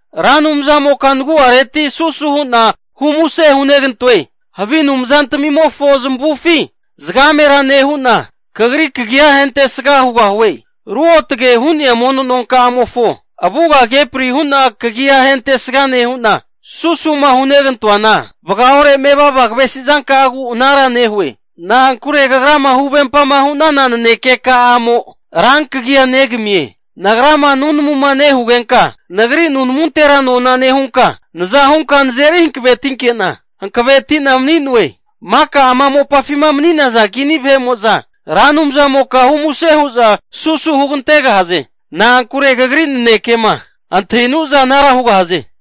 Ra Anumzamoka nagu'areti susu hu'na humuse hunegantoe. Havi anumzantamimofo zamavufi zagamera nehu'na, kagri kagi'a ahentesga hugahue. Ruotagema hu'nea mono nonka'amofo avugama kepri hu'na kagia ahentesga nehu'na, susuma hunegantoana vagaore mevava kavesi zanka'agu anara nehue. Na'ankure Kagrama huvempama hu'nana naneke ka'amo rankagia negamie. Nagrama nunamuma nehugenka nagri nunamuntera nona nehunka, naza hunka nazeri hankavetinke'na hankaveti'na mani'noe. Maka ama mopafima mani'naza kini vahe'mo'za Ra Anumzamoka humuse hu'za susu hugantegahaze. Na'ankure kagri nanekema antahinuza anara hugahaze.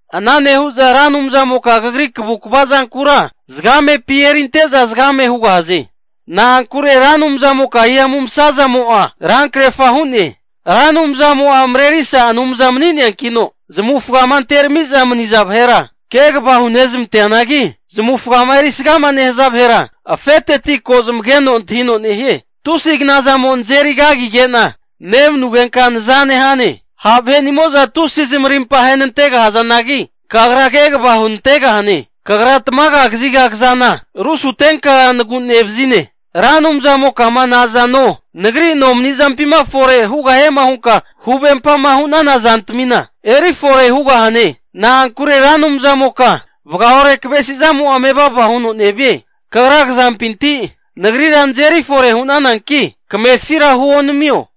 Ana nehu'za Ra Anumzamoka kagri kavukva zankura zagamepi erinte'za zagame hugahaze. Na'ankure Ra Anumzamoka hihamu masazamo'a rankrerfa hu'ne. Ra Anumzamo'a marerisa Anumza mani'neankino, zamavufagama anterami'za maniza vahera kegava hunezmanteanagi, zamavufagama erisga nehaza vahera afeteti ko zamageno antahino nehie. Tusi knazamo nazeri kagige'na nemanugenka naza nehane. Ha' vahenimo'za tusi zamarimpa ahenantegahazanagi, Kagra kegava hunantegahane. Kagra tamaga kaziga kazana rusutenka nagu'nevazine. Ra Anumzamokama nazano nagri nomani'zampima fore hugahiema hunkama huvempama hu'nana zantamina, eri fore hugahane. Na'ankure Ra Anumzamoka vagaore kavesi zamo'a mevava huno nevie. Kagra kazampinti nagrira nazeri fore hu'nananki kamefira huonamio.